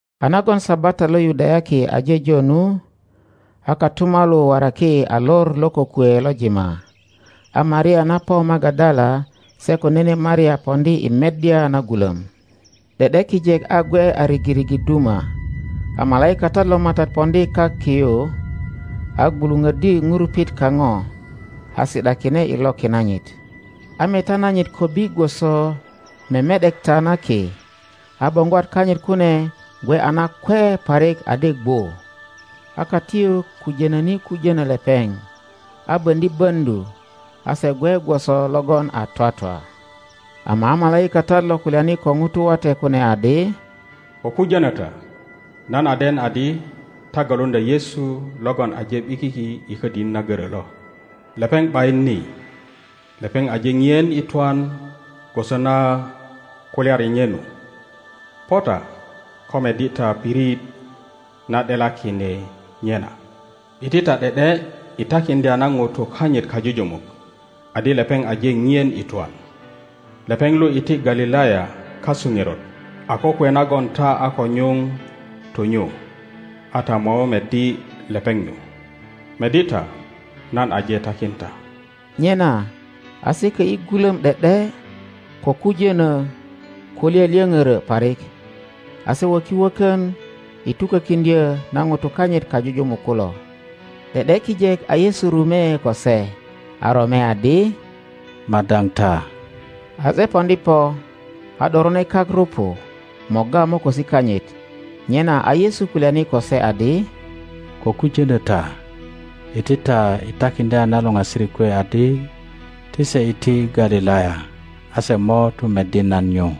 A nagon Sabata lo Yudayaki aje jo nu, a kotumalu waraki a lor lo kokwe lo jima, a Maria na po Magadala se ko nene Maria poŋdi i meddya na gulöm. ’De ’de kijek a gwe a rigirigi duma, a malaikatat lo MATAT poŋdi kak ki yu, a gwuluŋöddi ŋurupit kaŋo, a si ’dakine i loki nanyit. A meta nanyit kobbi gwoso meme ’dekta na ki, a boŋgwat kanyit kune gwe a nakwe parik adi gwu. A katiyuk kujonöni kujöno lepeŋ., a böŋdi böŋdu, a se gwe gwoso logon a twatwa. Ama a malaikatat lo kulyani ko ŋutu wate kune adi, Ko kujönö ta; nan a den adi ta galuŋdya Yesu logon aje ’bikiki i ködini na görö lo. Lepeŋ ’bayin ni. Lepeŋ aje pien i twan gwoso na kulyari nye nu. Po ta, ko meddi ta pirit na ’delakine nye na. Iti ta ’de ’de i takiŋdya na ŋutu kanyit kajujumuk adi lepeŋ. aje pien i twan, lepeŋ. lu iti Galilaya kasu ŋerot a kokwe nagon ta a ko nyuŋ tu nyu; a ta mo meddi lepeŋ. nyu. Meddi ta, nan aje takin ta. Nyena a se kö ’yi gulöm ’de ’de ko kujönö ko lyölyöŋiörö parik, a se wöki wökön i tukökiŋdyö na ŋutu kanyit kajujumuk kulo. ’De ’de kijek a Yesu rume ko se, a rome adi, Madaŋ ta! A se poŋdi po, a ’dorone kak rupu morga mokosi kanyit. Nyena a Yesu kulyani ko se adi, Ko kujönö ta. Iti ta i takiŋdya na luŋasirik kwe adi ti se iti Galilaya, a se mo tu meddi nan nyu.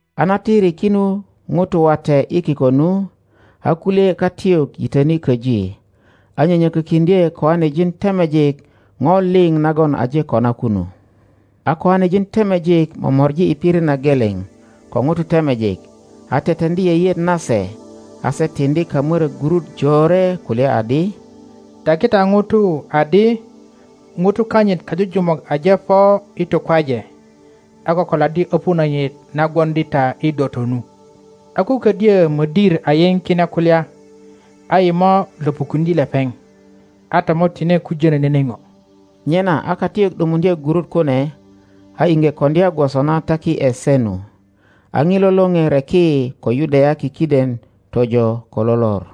A na tiri kinu ŋutu wate i kiko nu, a kulye katiyuk yitöni köji, a nyönyökökiŋdye koanejin temejik ŋo liŋ nagon aje kona kunu. a koanejin temejik momori i pirit na geleŋ ko ŋutu temejik, a teteŋdi yeyeet nase, a se tiŋdi kamörök gurut jore, kulya adi, Taki ta ŋutu adi ŋutu kanyit kajujumuk aje po i tukwaje, a kokoladdi öpu nanyit na gwoŋdi ta i doto nu. a ko ködyö mödir a yiŋ kine kulya, a yi mo löpukuŋdye lepeŋ, a ta mo tine kujönö nene ŋo. Nyena a katiyuk ’dumuŋdye gurut kune, a iŋge koŋdya gwoso na taki ’e se nu. A ŋilo lore reki ko Yudayaki kiden tojo ko lo lor.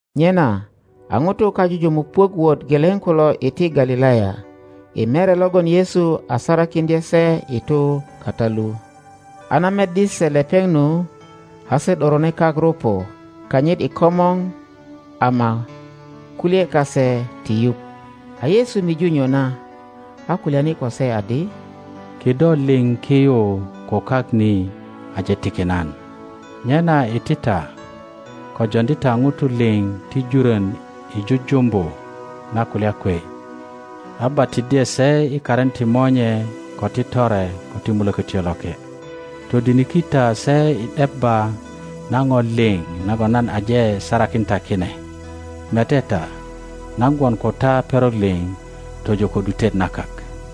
Nyena a ŋutu kajujumuk puök wot geleŋ kulo iti Galilaya, i mere logon Yesu a sarakiŋdye se i tu kata lu. A na meddi se lepeŋ nu, a se ’dorone kak rupu kanyit i komor; ama kulye kase ti yuŋ. A Yesu miju nyona, a kulyani ko se adi, Kido liŋ ki yu ko kak ni aje tiki nan. Nyena iti ta, ko joŋdi ta ŋutu liŋ ti juron i jujumbu na kulya kwe, a batiddye se i karin ti Monye, ko ti Tore, ko ti Mulökötyo Loke, todiniki ta se i debba na ŋo liŋ nagon nan aje sarakin ta kine; mete ta, nan gwon ko ta perok liŋ tojo ko ’dutet na kak.